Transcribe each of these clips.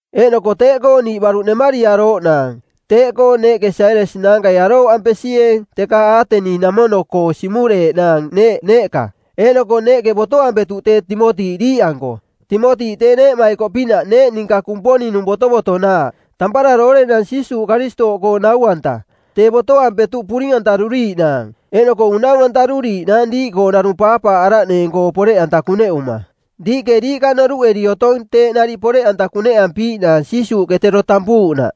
Eeꞌnoko teeꞌkoo niiꞌ baruꞌ nemariarooꞌnaang; teeꞌkoo neeꞌke Sailas naankai arooꞌampesieeng teka Aateni-namono-koo siꞌmureeꞌnaang neeꞌ neeꞌka, eeꞌnoko neeꞌke botoampetuꞌ tee Timoti diiꞌanko. Timoti tee neeꞌmaikoꞌpinaꞌ, neeꞌ ninka Kumponing-nung botovotonaaꞌ, tampara doorenang Jiisuuꞌ Karistooꞌkoong nau-anta. Tee botoampetuꞌ puring-antaruriiꞌnaang, eeꞌnoko unaunturiiꞌnaang diiꞌkoo narung paapaaꞌaraꞌneeng-koo poreꞌanta kuneꞌuma. Diiꞌke diiꞌka noruꞌeri otong teeꞌ nariꞌ poreꞌanta kuneꞌampiiꞌnaang Jiisuuꞌke tero tampuuꞌnaꞌ.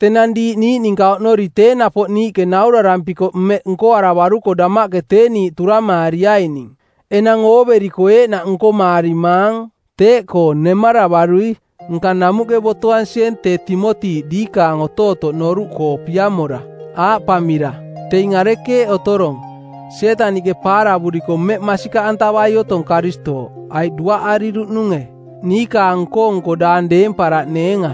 Tenang diiꞌ niiꞌ ninka oꞌnori tee napoꞌ niiꞌke naurarampikoꞌ mmeꞌ nkoaravaruko damaꞌke tee niiꞌ turamaariaining, enang ooveriko eeꞌnaꞌ nkomaarimaang. Teeꞌkoo, nemaravarui, nka namuꞌke botoansieeng tee Timoti diikaang otootoꞌ noruꞌkoo piamora, aaꞌpamira, “Teing arekeeꞌ otorong: Sietaniꞌke paaravuriko mmeꞌ masikaꞌantavai otong Karistooꞌ? Aiꞌ duaꞌariruꞌnunge?” – niikaang nko-nko daang deemparaꞌneenga.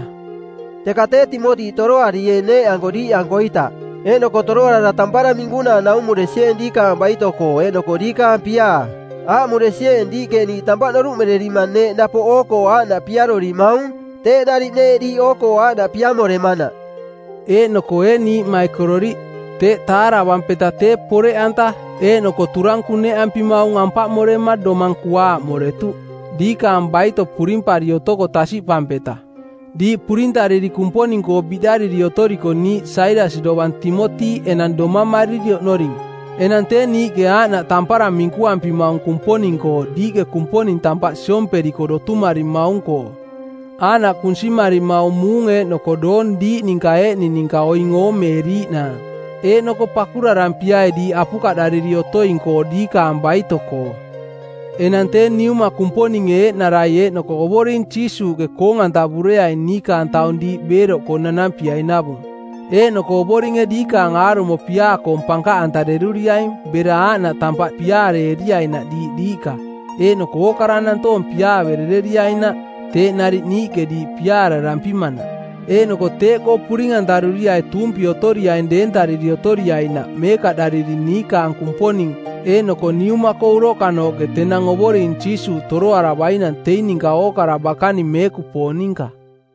Teka tee Timoti toroarieeng neeꞌanko diiꞌankoita. Eeꞌnoko toroarara tampara minkunaa naumuresieeng diikaang baito-koo eeꞌnoko diikaang piaa. Aaꞌmuresieeng diiꞌke niiꞌ tampaꞌ noruꞌmererima neeꞌ napoꞌ oo-koo aaꞌnaꞌ piarorimaung, teeꞌ nariꞌ neeꞌ diiꞌ oo-koo aaꞌnaꞌ piamoremanaꞌ. Eeꞌnoko ee niiꞌmaikororiꞌ, teeꞌ taaravampeta tee poreꞌanta eeꞌnoko turang kuneꞌampimaung ampaꞌmorema domang kuaaꞌmoretuꞌ, diikaang baito purimpari otoko tasiꞌpampeta. Diiꞌ purintariri Kumponing-koo biꞌdariri otoriko niiꞌ Sailas dovang Timoti enang domamariri oꞌnoring. Enang tee niiꞌke aaꞌnaꞌ tampara minkuampimaung Kumponing-koo diiꞌke Kumponing tampaꞌ siomperiko dotumarimaung-koo. Aaꞌnaꞌ kunsimarimaung muung eeꞌnoko doong diiꞌ ninka eeꞌning ninka oing oomeeriiꞌnaang. Eeꞌnoko pakurarampiai diiꞌ apukaꞌdariri otoing-koo diikaang baito-koo. Enang tee Niuma Kumponinge eeꞌnarai eeꞌnoko Ovoring Jiisuuꞌke koong-antavureaing niikaang taung diiꞌ beeroꞌkoo nanampiainavung. Eeꞌnoko Ovoringe diikaang aarumo piaa-koong pankaꞌantareruriaing bera aaꞌnaꞌ tampaꞌ piaareeriainaꞌ diiꞌ diiꞌka eeꞌnoko ookara nantoong piaaverereriainaꞌ, teeꞌ nariꞌ niiꞌke diiꞌ piaararampimanaꞌ. Eeꞌnoko teeꞌkoo puring-antaruriai tuumpi otoriaing deentariri otoriainaꞌ meekaꞌdariri niikaang Kumponing eeꞌnoko Niuma-koo uroꞌkanooꞌke tenang Ovoring Jiisuuꞌ Toroaravainang teing ninka ookara bakaning meekupoong ninka.